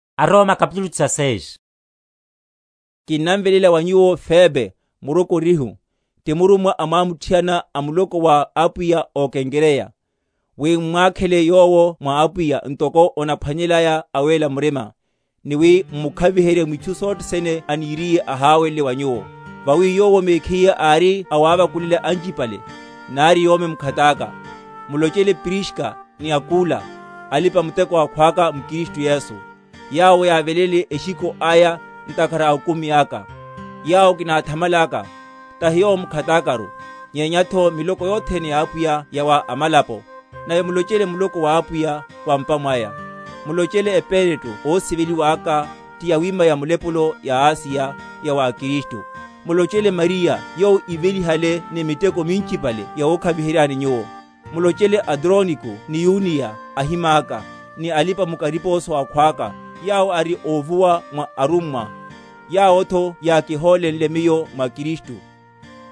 Olányana. Kinnamveléla wa nyuwo Febe, murokorihu, ti murummwa amwamuthiana a muloko wa Apwiya ó Kenkreya; wi m’mwakhele yowo mwa Apwiya, ntoko onáphwanelelaya awéla murima, ni wi m’mukhaviherye mwitchu sothe sene aniriye aháwelele wa nyuwo; vawi yowo mekhiye ári awávakulela anchipale, nari yomi mkhataka. Mulochele Priska ni Akula, alipa‐muteko akhwaka m’Kristu Yesu, yawo yávelénle eshikho aya ntakhara a okumi aka; yawo kináthamalaka, tahi yomi mekhakaru, nyenyatho miloko yothene ya Apwiya yawa amalapo; nave mulochele muloko wa Apwiya wa m’pa mwaya. Mulochele Epeneto ósiveliwa aka ti yawima ya mulepulo ya Asiya ya wa Kristu. Mulochele Mariya yowo ívelihale ni miteko minchipale yawokhaviheryani nyuwo. Mulochele Adroniko ni Yuniya, ahimaka, ni alipa‐mukariposo akhwaka, yawo ari óvuwa mwa arummwa, yawotho yákihólenle miyo mwa Kristu.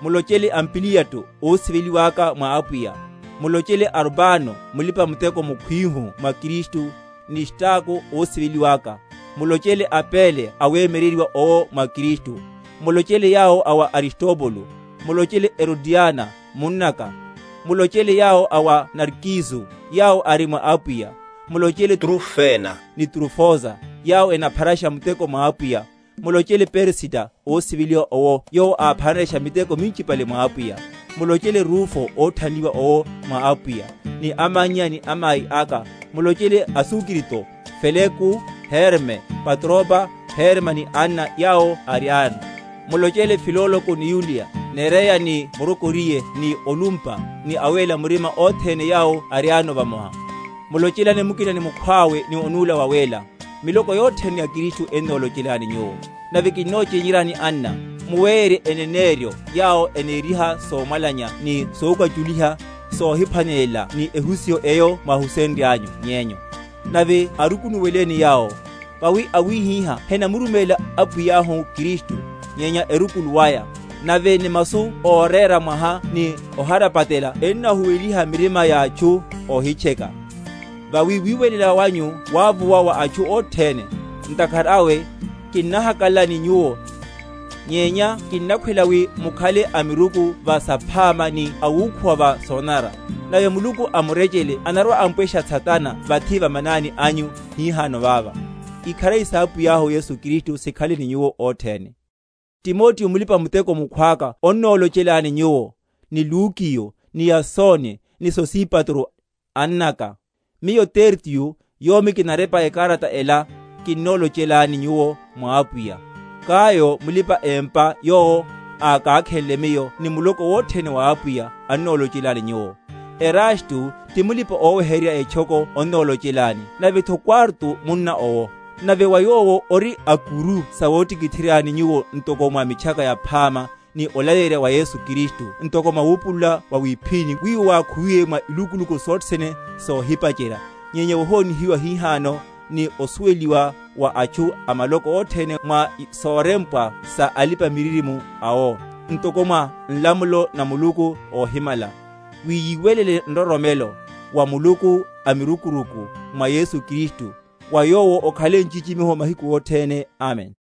Mulochele Ampliato ósiveliwa aka mwa Apwiya. Mulochele Arbano mulipa‐muteko mukhwihu mwa Kristu, ni Staku ósiveliwa aka. Mulochele Apele, awemyeryeryiwa owo mwa Kristu. Mulochele yawo a wa Aristobulo. Mulochele Herodiona, munnaka. Mulochele yawo a wa Narkiso, yawo ari mwa Apwiya. Mulochele Trufena, ni Trufosa, yawo enapharasha muteko mwa Apwiya. Mulochele Persida, ósiveliwa owo yowo ápharanshe miteko minchipale mwa Apwiya. Mulochele Rufo, óthanliwa owo mwa Apwiya, ni amannya ni amai aka. Mulochele Asukrito, Felego, Herme, Patroba, Herma ni anna yawo ariayano. Mulochele Filologo ni Yuliya, Nerea ni murokoriye, ni Olumpa, ni awéla murima othene yawo ariayano vamoha. Mulochelane mukina ni mukhwawe ni onúla wawéla. Miloko yothene ya Kristu ennolochelani nyuwo. Nave kinnochényeryani, anna, muwéyerye eneneryo yawo eneriha somwalanya ni sokwachuliha, sohiphwanelelana ni ehusiho eyo mwáhusenryanyu nyenyu; nave arukunuweleni yawo. Vawi awihiha henamuruméla Apwiyahu Kristu, nyenya erukulu aya; nave ni masu óréra mwaha ni óharapatela ennahuweliha mirima ya atchu óhitcheka. Vawi wiwelela wanyu wávuwa wa atchu othene. Ntakhara awe kinnahakalala ni nyuwo; nyenya kinakhwela wi mukhale amiruku va saphama ni awukhuwa va sonanara. Nave Muluku a murechele anarwa‐ampwesha Satana vathi va manani anyu hihano vava. Ikharari sa Apwiyahu Yesu Kristu sikhale ni nyuwo othene. Timoteo mulipa‐muteko mukhwaka onnolochelani nyuwo; ni Lukiyo ni Yasoni ni Sosipatro, annaka. Miyo Tertio, yomi kinarepa ekarata ela, kinnolochelani nyuwo mwa Apwiya. Gayo, mulipa‐empa yowo okákhenle miyo, ni muloko wothene wa Apwiya annolochelani nyuwo. Erasto, ti mulipa‐oweherya etchoko onnolochelani, navetho Kwarto munna owo. Nave wa Yowo ori a’kuru sawotikitheryani nyuwo ntoko mwa Mitchaka Yaphama, ni olaleyerya wa Yesu Kristu ntoko mwa wupulula wawíphíni wiwo wákhuwiwe mwa ilukuluku sothene sohipacherya, nyenya wohonihiwa hihano, ni osuweliwa wa atchu a maloko othene mwa sorempwa sa alipa‐miririmo awo, ntoko mwa nlamulo na Muluku óhimala, wi yiwelele nroromelo; wa Muluku amirukurukuru, mwa Yesu Kristu, wa Yowo okhale nchichimiho mahiku othene. Amen.